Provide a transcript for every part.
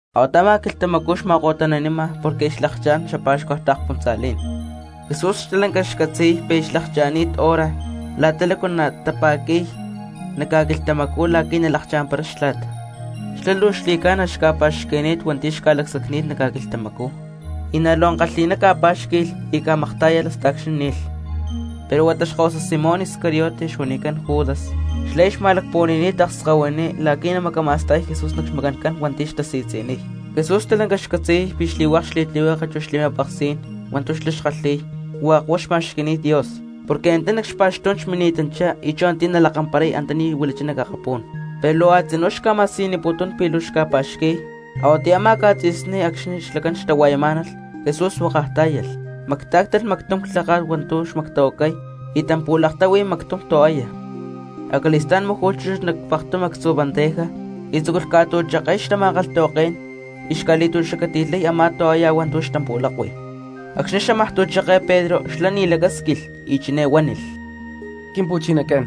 Ahuata a̠má quilhtamacú xma̠ko̠tani̠nama porque aya xlakchá̠n xapa̠xcua taakspuntza̠lí̠n, Jesús stalanca xcatzi̠y pi̠ aya xlakcha̠ni̠t hora la̠ta lácu natapa̠qui̠y nac ca̠quilhtamacú la̠qui̠ nalakamparay Xtla̠t. Xlá luu xli̠ca̠na xca̠pa̠xqui̠ni̠t hua̠nti̠ xca̠lacsacni̠t nac ca̠quilhtamacú, y na̠ luu ankalhi̠ná ca̠pá̠xqui̠lh y ca̠maktá̠yalh hasta acxni̠ ni̠lh. Pero huata xkahuasa Simón Iscariote xuanicán Judas, xlá aya xma̠lacpuhua̠ni̠ni̠t akskahuiní la̠qui̠ namacama̠stay Jesús nac xmacán hua̠nti̠ xtasi̠tzi̠niy. Jesús stalanca xcatzi̠y pi̠ xli̠hua̠k xli̠tlihueke chu xli̠ma̠peksí̠n hua̠ntu̠ xlá xkalhi̠y hua̠k huá xma̠xqui̠ni̠t Dios porque antá nac xpa̠xtú̠n xmini̠tanchá y chú antiyá nalakamparay antaní huilachá nac akapú̠n. Pero luu a̠tzinú xca̠ma̠siyuniputún pi̠ luu xca̠pa̠xqui̠y, a̠huatiyá a̠má ca̠tzi̠sní acxni̠ xlacán xtahua̠yamá̠nalh Jesús huákaj tá̠yalh, mactá̠ctalh mactum clháka̠t hua̠ntu̠ xmactahuacay y tampu̠laktáhui mactum toalla. Acali̠stá̠n máju̠lh chúchut nac pektum actzu bandeja y tzúculh ca̠tu̠cheke̠y xtama̠kalhtahuaké̠n y xca̠li̠tu̠xacati̠lhay a̠má toalla hua̠ntu̠ xtampu̠lakui. Acxni̠ xámaj tu̠cheke̠y Pedro xlá ni̠ lacásquilh y chiné huánilh: —Quimpu̠chinacán,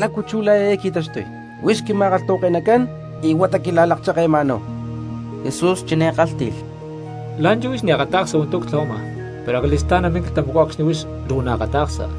¿lácu chú la̠ eé qui̠taxtuy, huix quima̠kalhtahuake̠nacán y huata quila̠laccheke̠ma̠náhu? Jesús chiné kálhti̠lh: —La̠nchú huix ni̠ akata̠ksa hua̠ntu̠ ctlahuama, pero acali̠stá̠n namín quilhtamacú acxni̠ huix luu naakata̠ksa.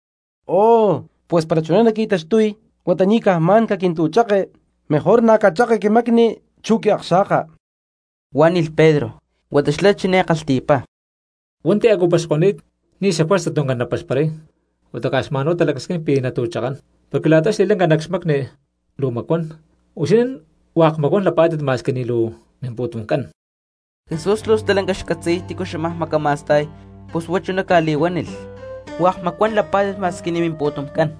—¡Oh, pues para chuná naqui̠taxtuy, huata ni̠ caj xma̠n caquintu̠cheke, mejor na̠ cacheke quimacní̠n chu quiakxa̠ka! —huánilh Pedro. Huata xlá chiné kalhti̠pá: —Hua̠nti̠ a̠cu paxko̠ni̠t, ni̠ xajuerza tuncán napaxparay, huata caj xma̠n talacasquín pi̠ natu̠chakán, porque la̠ta xli̠lanca nac xmacni luu macscarancu; huixinín hua̠k macuán lapá̠tit ma̠squi ni̠ luu mimpu̠tumcán. Jesús luu stalanca xcatzi̠y tícu xámaj macama̠sta̠y pus huá chuná ca̠li̠huánilh: “Hua̠k macuán lapá̠tit ma̠squi ni̠ mimpu̠tumcán.”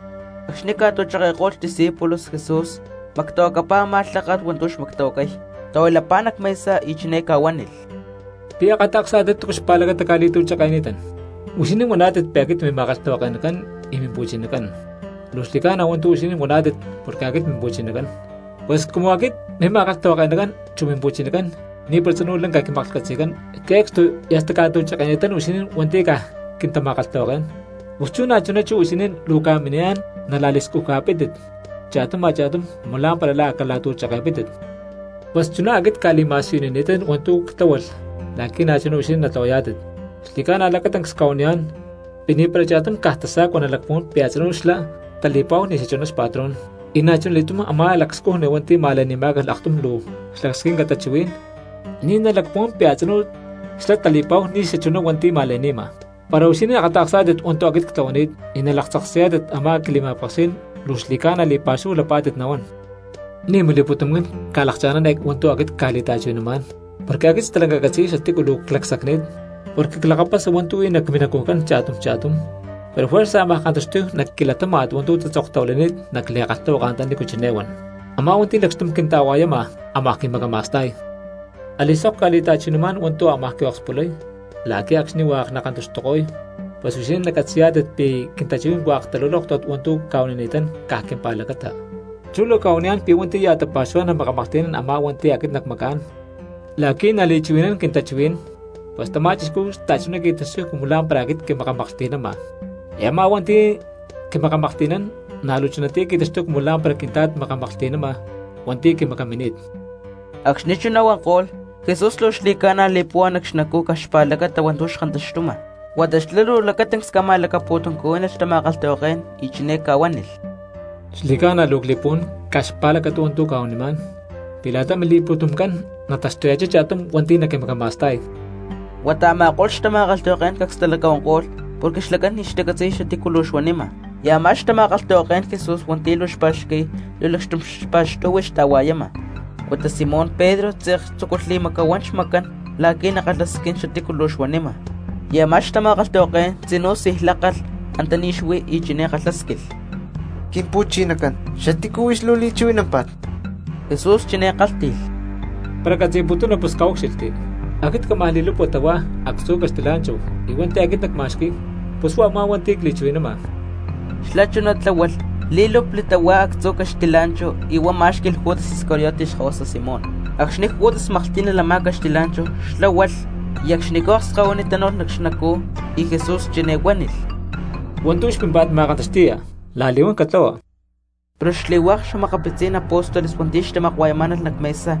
Acxni̠ ca̠tu̠cheke̠ko̠lh xdiscípulos Jesús mactahuacapá a̠má lháka̠t hua̠ntu̠ xmactahuacay, tahuilapá nac mesa y chiné ca̠huánilh: —¿Pi̠ akata̠ksá̠tit túcu luu xpa̠lacata cca̠li̠tu̠cheke̠ni̠tán? Huixinín huaná̠tit pi̠ aquit mima̠kalhtahuake̠nacán y mimpu̠chinacán. Luu xli̠ca̠na hua̠ntu̠ huixinín huaná̠tit porque aquit mimpu̠chinacán. Pues cumu aquit mima̠kalhtahuake̠nacán chu mimpu̠chinacán ni̠para tzinú lanca quimaklhcatzi̠cán que̠cstu y hasta cca̠tu̠cheke̠ni̠tán huixinín hua̠nti̠ caj quintama̠kalhtahuaké̠n, pus chú na̠chuná chú huixinín luu ca̠mini̠niyá̠n nala̠li̠scuja̠pítit cha̠tum a̠cha̠tum cumu lá̠mpara la̠ a̠ cala̠tu̠cheke̠pítit. Pues chuná aquit cca̠li̠ma̠siyunini̠tán hua̠ntu̠ ctláhualh la̠qui̠ na̠chuná huixinín natlahuayá̠tit. Xli̠ca̠na lacatancs cca̠huaniyá̠n, pi̠ ni̠para cha̠tum caj tasa̠cua nalacpuhuán pi̠ a̠tzinú xlá tali̠pa̠hu ni̠ xachuná xpatrón; y na̠chuna li̠túm a̠má lacscujni hua̠nti̠ ma̠le̠ni̠má̠calh aktum luu xlacasquinca tachuhuí̠n, ni̠ nalacpuhuán pi̠ a̠tzinú xlá tali̠pa̠hu ni̠ xachuná hua̠nti̠ ma̠le̠ni̠nama. Para huixinín akata̠ksá̠tit hua̠ntu̠ aquit ctlahuani̠t y nalaktzaksayá̠tit a̠má quili̠ma̠peksí̠n luu xli̠ca̠na li̠pa̠xúhu lapá̠tit nahuán. ’Ni̠ mili̠pu̠tumcán ca̠lakcha̠ná̠n eé hua̠ntu̠ aquit cca̠li̠ta̠chuhui̠namá̠n, porque aquit stalanca ccatzi̠y xatícu luu clacsacni̠t porque clakapasa hua̠ntu̠ huí nac minacujcán cha̠tum cha̠tum, pero juerza ámaj kantaxtuy nac quilatáma̠t hua̠ntu̠ tatzoktahuilani̠t nac li̠kalhtahuaka antaní chiné huan: “Amá hua̠nti̠ lacxtum xquinta̠hua̠yama ámaj quimacama̠sta̠y.” Ali̠sok cca̠li̠ta̠chuhui̠namá̠n hua̠ntu̠ ámaj quiokspulay la̠qui̠ acxni̠ hua̠k nakantaxtuko̠y pues huixinín nacatzi̠yá̠tit pi̠ quintachuhuí̠n hua̠k talulóktat hua̠ntu̠ cca̠huanini̠tán caj quimpa̠lacata. Chú luu cca̠huaniyá̠n pi̠ hua̠nti̠ ya̠ tapa̠xuhuá̠n namakamaklhti̠nán a̠má hua̠nti̠ aquit nacmacá̠n la̠qui̠ nali̠chuhui̠nán quintachuhuí̠n, pus tamá cristiano xta̠chuná qui̠taxtuy cumu lá̠mpara aquit quimakamaklhti̠nama, y a̠má hua̠nti̠ aquit quimakamaklhti̠nán na̠ luu chunatiyá qui̠taxtuy cumu lá̠mpara Quintla̠t makamaklhti̠nama hua̠nti̠ quimacamini̠t. Acxni̠ chuná huanko̠lh, Jesús luu xli̠ca̠na li̠púhua nac xnacú caj xpa̠lacata hua̠ntu̠ xkantaxtuma, huata xlá luu lacatancs ca̠ma̠lacapu̠tuncuhuí̠nilh xtama̠kalhtahuaké̠n y chiné ca̠huánilh: —Xli̠ca̠na luu cli̠puhuán caj xpa̠lacata hua̠ntu̠ cca̠huanimá̠n pi̠ la̠ta mili̠pu̠tumcán nataxtuya̠chá cha̠tum hua̠nti̠ naquimacama̠sta̠y. Huata a̠ma̠ko̠lh xtama̠kalhtahuaké̠n cacs talacahuanko̠lh porque xlacán ni̠ xtacatzi̠y xatícu luu xuanima. Y a̠má xtama̠kalhtahuaké̠n Jesús hua̠ntu̠ luu xpa̠xqui̠y luu lacxtum xpa̠xtu̠hui xta̠hua̠yama, huata Simón Pedro tze̠k tzúculh li̠macahuán xmacán la̠qui̠ nakalhasquín xatícu luu xuanima. Y a̠má xtama̠kalhtahuaké̠n tzinú sij lákalh antaní xuí y chiné kalhásquilh: —Quimpu̠chinacán, ¿xatícu huix luu li̠chuhui̠námpa̠t? Jesús chiné kálhti̠lh: —Para catzi̠putuna pus caúcxilhti, aquit cámaj li̠lupa tahuá actzu caxtilá̠nchahu y hua̠nti̠ aquit nacma̠xqui̠y pus huá a̠má hua̠nti̠ cli̠chuhui̠nama. Xlá chuná tláhualh lí̠lupli tahuá actzu caxtilá̠nchahu y huá má̠xqui̠lh Judas Iscariote xkahuasa Simón. Acxni̠ Judas maklhtí̠nalh a̠má caxtilá̠nchahu xlá hualh, y acxnicú akskahuiní tánu̠lh nac xnacú, y Jesús chiné huánilh: —Hua̠ntu̠ huix pímpa̠t ma̠kantaxti̠ya la̠li̠huán catlahua. Pero xli̠hua̠k xa̠makapitzí̠n apóstoles hua̠nti̠ xtamakua̠yamá̠nalh nac mesa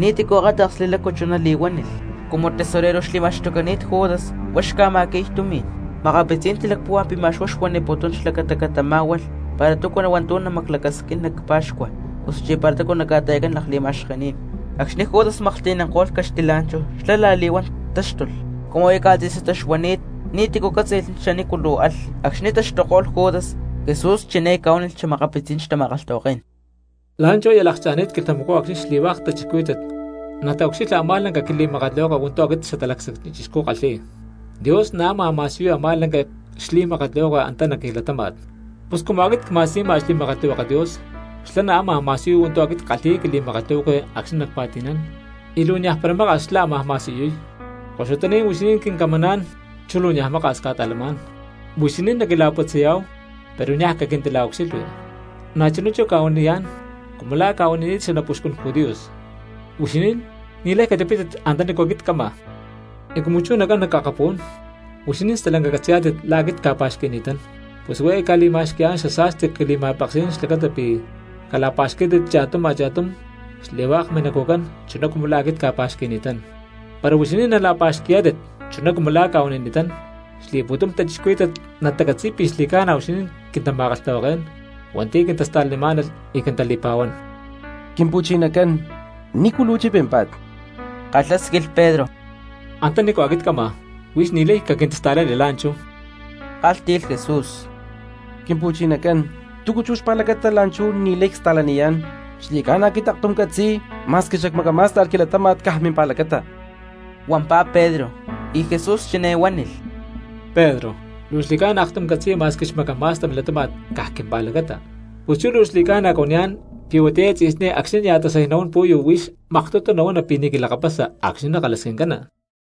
ni̠tícu akáta̠ksli lácu chuná li̠huánilh. Cumu tesorero xli̠ma̠xtucani̠t Judas, huá xca̠ma̠xqui̠y tumi̠n, makapitzí̠n talacpúhua pi̠ ma̠x huá xuaniputún xlacata catamá̠hualh para túcu hua̠ntu̠ namaclacasquincán nac pa̠xcua osuchí para túcu naca̠ta̠i̠cán lakli̠ma̠xkení̠n. Acxni̠ Judas maklhti̠nanko̠lh caxtilá̠nchahu xlá la̠li̠huán táxtulh, cumu aya ca̠tzi̠satá xuani̠t ni̠tícu cátzi̠lh xanícu luu alh. Acxni̠ taxtuko̠lh Judas, Jesús chiné ca̠huánilh xa̠makapitzí̠n xtama̠kalhtahuaké̠n: —La̠nchú aya lakcha̠ni̠t quilhtamacú acxni̠ xli̠hua̠k cristianos nataucxilha a̠má lanca quili̠makatlihueke hua̠ntu̠ aquit Xatalacsacni Chixcú ckalhi̠y, Dios na̠ ámaj ma̠siyuy a̠má lanca xli̠makatlihueke antá nac quilatáma̠t. Pus cumu aquit cma̠siyuma xli̠makatlihueke Dios, xlá na̠ ámaj ma̠siyuy hua̠ntu̠ aquit ckalhi̠y quili̠makatlihueke acxni̠ nacpa̠ti̠nán, y luu niaj para maka̠s la̠ xlá ámaj ma̠siyuy. Koxutaní̠n huixinín quincamaná̠n, chú luu niaj maka̠s cca̠ta̠lamá̠n. Huixinín naquila̠putzayá̠hu pero niaj naquintila̠ucxilhui; na̠chuná chú cca̠huaniyá̠n cumu la̠ cca̠huani̠t xanapuxcún judíos, huixinín ni̠lay catipítit antanícu aquit cama. Y cumu chú nacán nac akapú̠n, huixinín stalanca catzi̠yá̠tit la̠ aquit cca̠pa̠xqui̠ni̠tán, pus huá eé cca̠li̠ma̠xqui̠yá̠n xasa̠sti quili̠ma̠peksí̠n xlacata pí cala̠pa̠xquí̠tit cha̠tum a̠cha̠tum xli̠hua̠k minacujcán chuná cumu la̠ aquit cca̠pa̠xqui̠ni̠tán. Para huixinín nala̠pa̠xqui̠yá̠tit chuná cumu la̠ cca̠huanini̠tán, xli̠pu̠tum cristianos natacatzi̠y pi̠ xli̠ca̠na huixinín quintama̠kalhtahuaké̠n hua̠nti̠ quintasta̠lanimá̠nalh y quintali̠pa̠huán. —Quimpu̠chinacán, ¿nícu luu chipímpa̠t? —kalhásquilh Pedro. —Antanícu aquit cama huix ni̠lay caquintista̠lani la̠nchú —kálhti̠lh Jesús. —Quimpu̠chinacán, ¿túcu chú xpa̠lacata la̠nchú ni̠lay cli̠sta̠laniyá̠n? Xli̠ca̠na aquit aktum ccatzi̠y ma̠squi xacmacamá̠sta̠lh quilatáma̠t caj mimpa̠lacata —huampá Pedro. Y Jesús chiné huánilh: —Pedro, ¿luu xli̠ca̠na aktum catzi̠ya ma̠squi xmacama̠sta milatáma̠t caj quimpa̠lacata? Pus chú luu xli̠ca̠na cuaniyá̠n pi̠ huatiyá eé tzi̠sní acxni̠ nia̠ tasay nahuán pu̠yu huix maktutu nahuana pi̠ ni̠ quilakapasa acxni̠ nakalhasquincana.